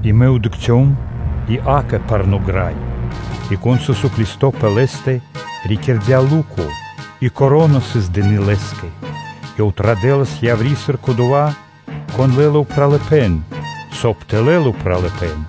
И мэ дыкхцём, и, акэ, парно́ грай. И кон сыс уклисто пэ лэ́стэ, рикирдя лу́ко и вя́нка (коро́на) сыс дыны́ лэ́скэ. Ёв традэлас яври́, сыр кодова́, кон лэ́ла упралыпэ́н, соб (кай) тэ лэл упралыпэ́н.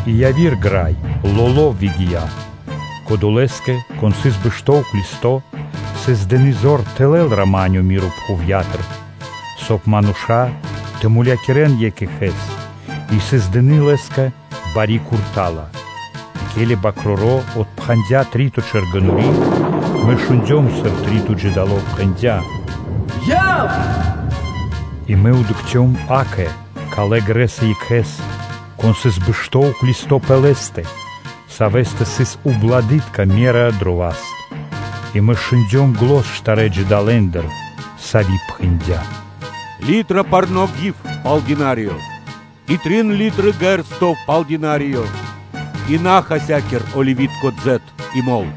И выгия́ яви́р грай, лоло́. Кодолэ́скэ, кон сыс бэшто́ уклисто́/э́, сыс дыны́ зор тэ лэл рама́нё (миро) пхувья́тыр, соб (кай) мануша́ тэ мулякирэ́н екх екхэ́с и сыс дыны́ лэ́скэ бари курта́ла (сабля). И ке́ли Свэ́нто Бакроро́ отпхандя три́то чэргэнори́, мэ шундём, сыр три́то джидало пхэндя́: “Яв и дыкх!” И мэ дыкхцём, акэ, калэ́ грэс и екхэ́с, кон сыс бэшто́ уклисто́/э́ пэ лэ́стэ, савэ́стэ сыс ублады́тка (весы) дрэ васт. И мэ шундём зан штарэ́ джидалэндыр, со пхэндя́: “Литра парно́ гив пал дынариё и трин литры ґэрсто (ячменё) пал динариё. И на хасякир оливи́тко дзэт (елеё) и мол.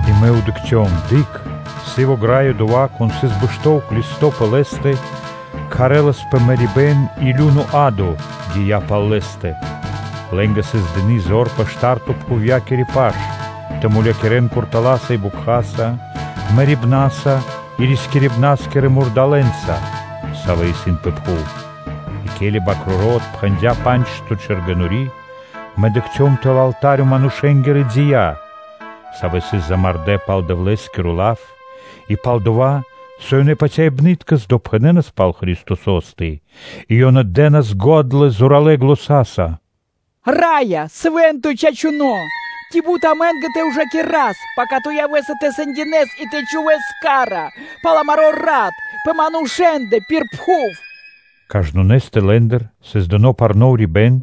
И мэ дыкхцём: Акэ! Сыво грай и одова́, кон сыс бэшто́ уклисто́/э́ нэ лэ́стэ, кхарэ́ласпэ мэрибэ́н, и лю́но (адо) гия́ пал лэ́стэ. Лэ́нгэ сыс дыны́ зор пэ шта́рто пхувья́кири паш тэ мулякирэ́н куртала́са и бокхаса, мэрибнаса и рискирибна́скирэ мурдалэ́нца, савэ́ исын пэ пхув. И ке́ли Свэ́нто Бакроро́ отпхандя па́нджто чэргэнори́, мэ дыкхцём тэл алта́рё манушэ́нгирэ дия́, савэ́ сыс мулякирдэ́ пал Дэвлэ́скиро лав и пал дова́, со ёнэ патяибныткэс допхэнэнас пал Христосо́стэ; и ёнэ дэ́нас го́дла зоралэ́ заня́са: “Раё, Свэ́нто и Чачуно́! Ци бут амэ́нгэ тэ ужакирас, пака Ту явэ́са тэ сэндякирэс и тэ чхувэ́с ка́ра пал амаро́ рат пэ манушэ́ндэ пир пхув?” Кажнонэ́скэ лэ́ндыр сыс дыно́ парно́ урибэ́н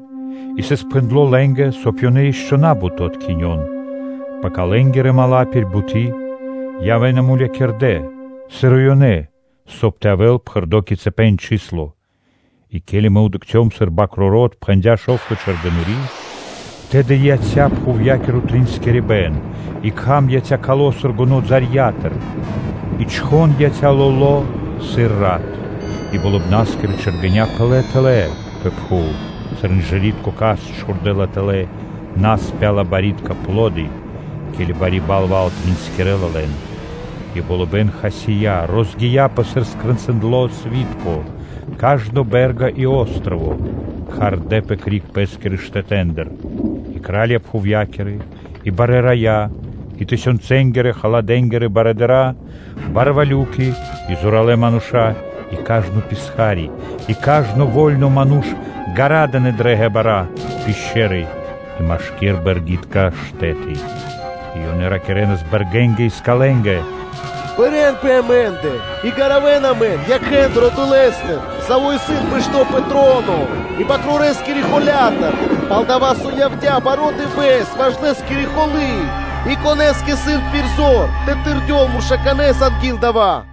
и сыс пхэндло́ лэ́нгэ, соб (кай) ёнэ ишчо (инкэ́) на́бут тэ откхинён, пака лэ́нгирэ мала́ (дру́ги) пир буты́ и лэ́нгирэ пша́ла явэ́на мулякирдэ́, сыр и ёнэ, соб (кай) тэ явэ́л пхэрдо́ кицыпэн (количэство). И ке́ли мэ дыкхцём, сыр Свэ́нто Бакроро́ отпхандя шо́вто чэргэнори́, тэды яця́ пхувья́киро тринскирибэн, и кхам яця́ кало́ сыр гоно́ балэндыр, и чхон яця́ лоло́ сыр рат; и болыбна́скирэ чэргэня́ пынэ́ тэлэ́ пэ пхув сыр инжыритко кашт чхурдэ́ла тэлэ́ наспяла барьякирдэ́ (пло́ды), ке́ли бари балва́л тринскирэла лэн. И болыбэ́н хасия́, розгия́пэ сыр скрэнцындло сви́тко, кажно бэ́рга и о́строво (джип) кхардэпэ (двигиндлэпэ) криг пэ́скирэ штэтэ́ндыр. И кра́лья пхувья́кирэ, и барэ́ рая́, и тысёнцэнгирэ-халадэ́нгирэ барыдыра́, барвалюки, и зоралэ́ мануша́, и кажно писха́ри, и кажно во́льно ману́ш ґарадынэ дрэ ґебара́ (пешчэры) и машки́р бэргитка штэ́ты, и ёнэ ракирэ́нас бэргэнгэ и скалэнгэ: “Пэрэн пэ амэ́ндэ и гаравэн амэн якхэ́ндыр Одолэ́стыр, Саво́ исын бэшто́ пэ троно, и Свэнтонэ́ Бакрорэскирэ холя́тыр, пал-дова́ со явдя́ важно дывэ́с ваш Лэ́скири холы́ и конэ́скэ исын пир зор тэ тэрдёл муршканэ́с анги́л дава́?”